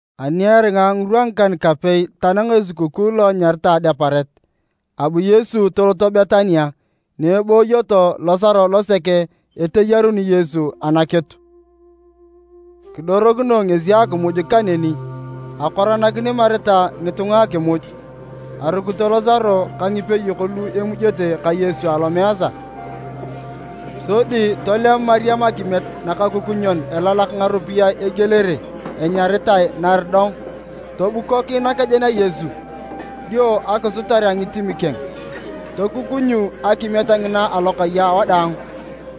Ani eringa ngirwa ngikan-kapei tanang esukukuu lo enyaritae Adeparet, abu Yesu tolot Betania, ni ebooyo Losaro losek eteyaruni Yesu anakitu. Kidorokinoe ngesi akimuj kaneni, akoranakini Marita ngitunga akimuj. Arukito Losaro ka ngipeyok lu emujete ka Yesu alomeesa. Sodi tolem Mariam akimiet nakakukunyon elalak ngaropiyae egielere enyaritae nardog tobukok nakejen a Yesu, dio akisutar a ngitim keng. Tokukunyu akimiet ngina alokai awadaang.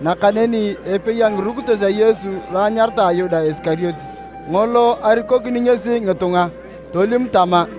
Nakaneni epei a ngirukitos a Yesu lo enyaritae Yuda Isikariote, ngolo arikokini ngesi ngitunga, tolim tama,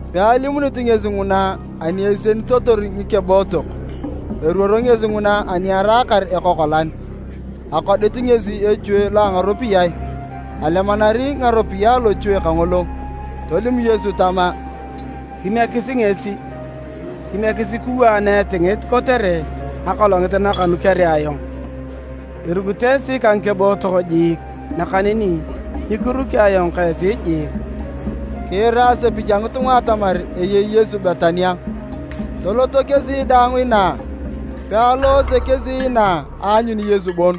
Pealimunit ngesi nguna ani esienitotor ngikebootok, eruoro ngesi nguna ani araakar ekokolan. Akodit ngesi echue lo a ngaropiyae, alemanari ngaropiyae alochue kangolo. Tolim Yesu tama, “Kimiekisi ngesi! Kimiekisi kiwaa naetingit kotere akolongit nakanukere ayong. Irukito esi ka ngikebootok jiik, nakaneni nyikiruki ayong ka esi jiik.” Kiira asepich a ngitunga atamar eyei Yesu Betania, toloto kesi daang inaa. Pealoose kesi inaa aanyun Yesu bon,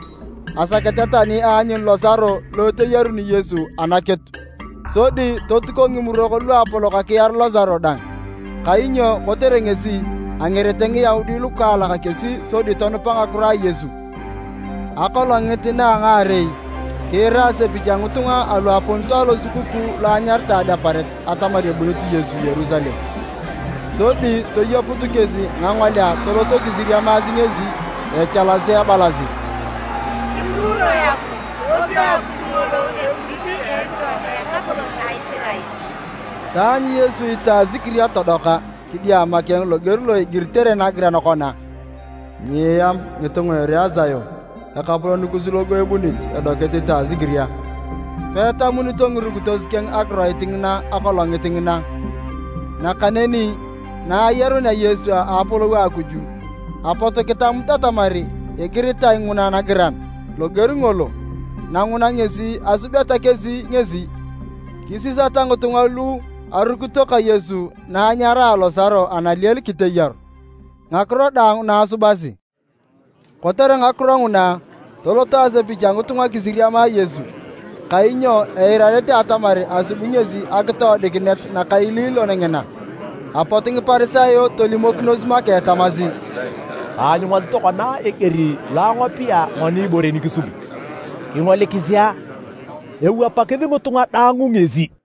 asakete tani aanyun Losaro lo eteyaruni Yesu anakitu. Sodi totuko Ngimurok Luapolok akiar Losaro dang, kainyo kotere ngesi, angerete Ngiyaudi lukaalak kesi sodi tonupa ngakiro a Yesu. Akolongit na a ngaarei, kiira asepich a ngitunga alu aponito Losukukuu lo anyaritae Adeparet atamar ebunit Yesu Yerusalem. Sodi toyeput kesi ngangolea toloto kisiriamiasi ngesi echalasi ebalasi, “Kipuruunoe Akuj! Topia Akuj ngolo ebunit a ekiro a Ekapolon a Isirael!” Taanyu Yesu itasikiria todoka kidiama keng loger lo igiritae nagiran kona, “Nyieam ngitunga a ere a Sion! Ekapolon kus logo ebunit, edokit itasikiria.” Peetamunito ngirukitos keng akiroit ngina akolongit ngina, nakaneni na ayarunea Yesu a apolou a Akuj, apot kitamut atamar egiritae nguna nagiran loger ngolo, na nguna ngesi asubeta kesi ngesi. Kisisata ngitunga lu arukito ka Yesu na anyaraa Losaro analiel kiteyaru, ngakiro daang na asubasi kotere ngakiro nguna, tolot asepich a ngitunga kisiriama Yesu, kainyo eirarete atamar asubi ngesi akitoodikinet nakaililon ngina. Apot Ngiparisayo tolimokinos make tamasi, “Taanyungasi tokona eger lo angopea ngoni ibore nikisubi. Kingolikisi a! Ewapakis ngitunga daang ngesi!”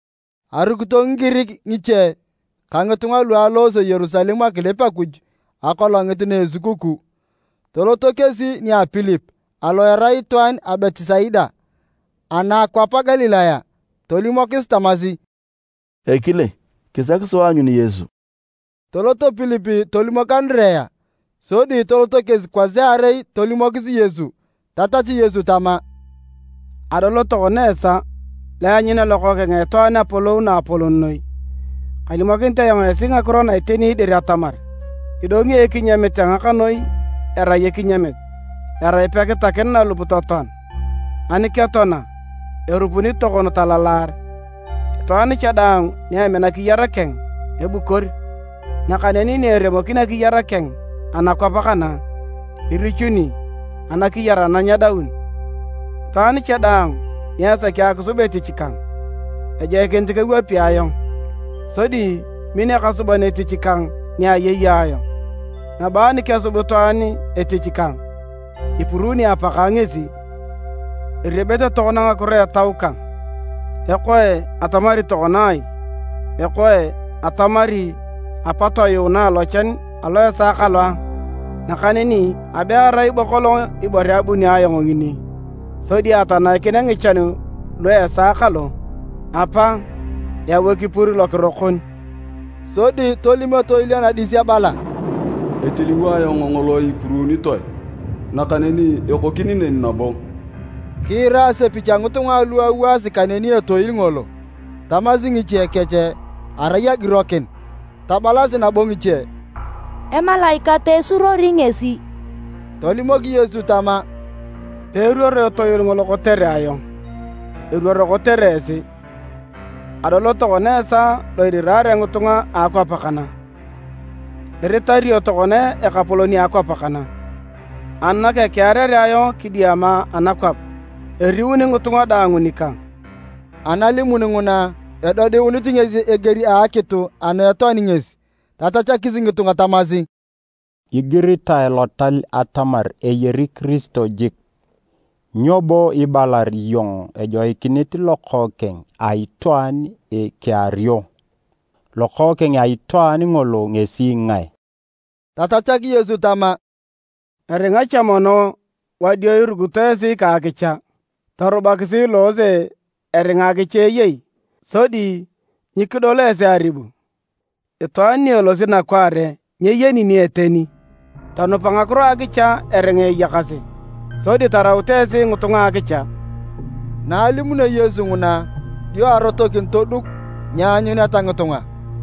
Arukito Ngigirik ngiche ka ngitunga lu aloose Yerusalem akilip Akuj akolongit na esukukuu. Toloto kesi nia Pilip (alo erai itwaan a Betisaida ana a akwap a Galilaya), tolimokis tamasi, “Ekile, kisaki sua aanyun Yesu.” Tolot Pilip tolimok Andirea, sodi toloto kesi kwasiarei tolimokis Yesu. Tatachu Yesu tama, “Adol tokona esaa lo eanyunea Lokookeng a Itwaan apolou naapolon noi. Kalimokinit ayong esi ngakiro na iteni dir atamar, idongi ekinyamit a ngakanoi erai ekinyamit, erai pekitakin nalup totoan! Ani ketoana, erupuni tokon talalar. Itwaan cha daang ni emina akiyar keng, ebukor, nakaneni ni eremokin akiyar keng anakwap kana, irichuni anakiyar ana nyedaun. Itwaan cha daang ni esaki akisub etich kang, ejoikinit kewapi ayong, sodi min ekasuban etich kang ni ayei ayong. Nabo ani kesub itwaan etich kang, ipuruuni Apakang ngesi. “Eriebete tokona ngakiro etau kang, ekoe atamari tokona ai? Ekoe, atamari, ‘Apa, toyuunae alochan alu a esaa kalo a’? Nakaneni abe erai bo kolong ibore abunio ayong ngini sodi atanaikinea ngichan lu esaa kalo. Apa, yau ekipur lokiro kon!” Sodi tolim etoil anadis ebala, “Etiliwo ayong ngolo lo ipuruunitoe, nakaneni ekokini neni nabo.” Kiira asepich a ngitunga alu awaasi kaneni etoil ngolo, tamasi ngiche kech arai agirokin, tabalasi nabo ngiche, “Emalaikat esuruori ngesi!” Tolimok Yesu tama, “Peeruoro etoil ngolo kotere ayong, eruoro kotere esi. Adol tokona esaa lo iriraare ngitunga a akwap kana, iritario tokona ekapolon a akwap kana. Ani nakekearere ayong kidiama anakwap, eriuni ngitunga daang nikang.” ( Analimun nguna, edodiunit ngesi eger a akitu ana etoani ngesi.) Tatachakis ngitunga tamasi, “Igiritae Lotal atamar eyari Kiristo jik. Nyoni bo ibalar iyong ejoikinit Lokookeng a Itwaan ikeario? Lokookeng a Itwaan ngolo ngesi ngae?” Tatachak Yesu tama, “Eringa cha mono wadio irukito esi ka akicha. Torubakisi iloose eringa akicha eyei, sodi nyikidol esi aribu. Itwaan ni elosi nakwaare nyeyeni ni eteni. Tonupa ngakiro a akicha eringa eyakasi, sodi taraut esi ngitunga a akicha.” Awounete ngitunga akinup Na alimunio Yesu nguna, dio arotokin toduk nyeanyuneta ngitunga.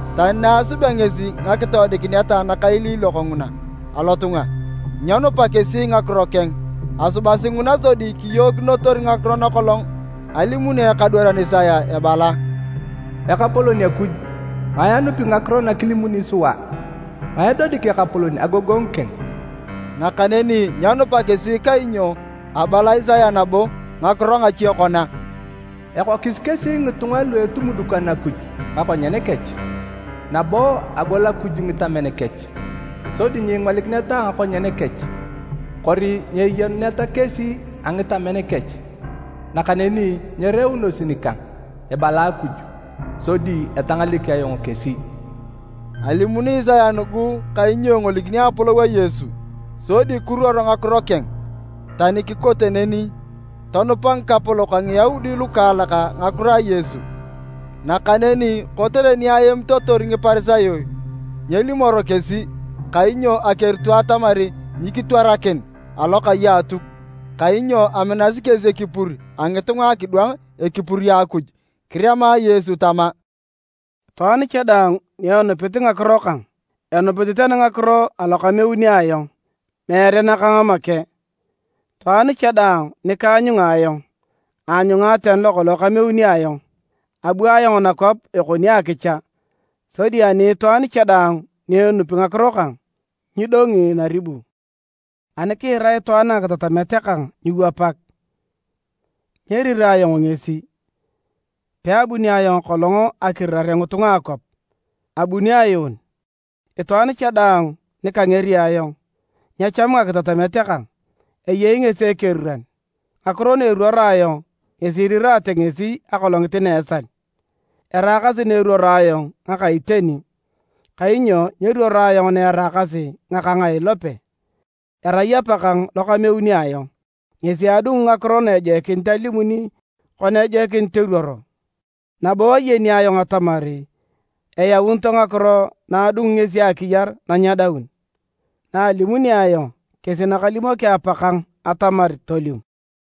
Tani na asubea ngesi ngakitoodikinet nakailiilok nguna alotunga, nyenupa kesi ngakiro keng. Asubasi nguna sodi kiyookinotor ngakiro nakolong alimuni ekadwaran Isaya ebala: “Ekapolon Akuj, ngae anupi ngakiro nakilimuni sua? Ngae edodik Ekapolon agogongu keng?” Nakaneni nyenupa kesi kainyo abala Isaya nabo ngakiro ngache kona, “Ekokis kesi ngitunga lu etumudukan Akuj ngakonyen kech, nabo agol Akuj ngitamen kech, sodi nyingolikineta a ngakonyen kech, kori nyeyenuneta kesi a ngitamen kech, nakaneni nyereunosi nikang, ebala Akuj, sodi etangalek ayong kesi.” Alimuni Isaya nugu kainyo engolikini apolou a Yesu, sodi kiruor ngakiro keng. Tani kikote neni, tonupa ngikapolok a Ngiyaudi lukaalak ngakiro a Yesu. Nakaneni kotere ni aemitotor Ngiparisayo, nyelimoro kesi, kainyo akerito atamar nyikitwarakin alokai a Atuk. Kainyo aminasi kesi ekipur a ngitunga akidwang ekipur a Akuj. Kirema Yesu tama, “Itwaan cha daang ni enupit ngakiro kang, enupit tani ngakiro alo kameuni ayong, meere nakang make. Itwaan cha daang nikaanyunga ayong, aanyunga tani lokolong kameuni ayong. Abu ayong nakwap ekoni akicha, sodi ani itwaan cha daang ni enupi ngakiro kang, nyidongi naribu. Ani kiira itwaan ngakitatamet kang nyiiwapak, nyerirae ayong ngesi. Peabuni kolong ayong akirirare ngitunga a akwap, abuni ayuun. Itwaan cha daang ni kangeri ayong, nyeechamu ngakitatamet kang, eyei ngesi ekeriran. Ngakiro na eruoro ayong ngesi iriraate ngesi akolongit na a esal! Eraakasi na eruoro ayong ngaka iteni kainyo nyeruoro ayong naeraakasi ngakang a ilope, erai Apakang lo kameuni ayong, ngesi adungu ngakiro na ejoikinit alimuni kana ejoikinit eruoro. Nabo ayeni ayong atamar eyaunito ngakiro na adungu ngesi akiyar na nyedaun. Na alimuni ayong kesi nakalimoki Apakang atamar tolim.”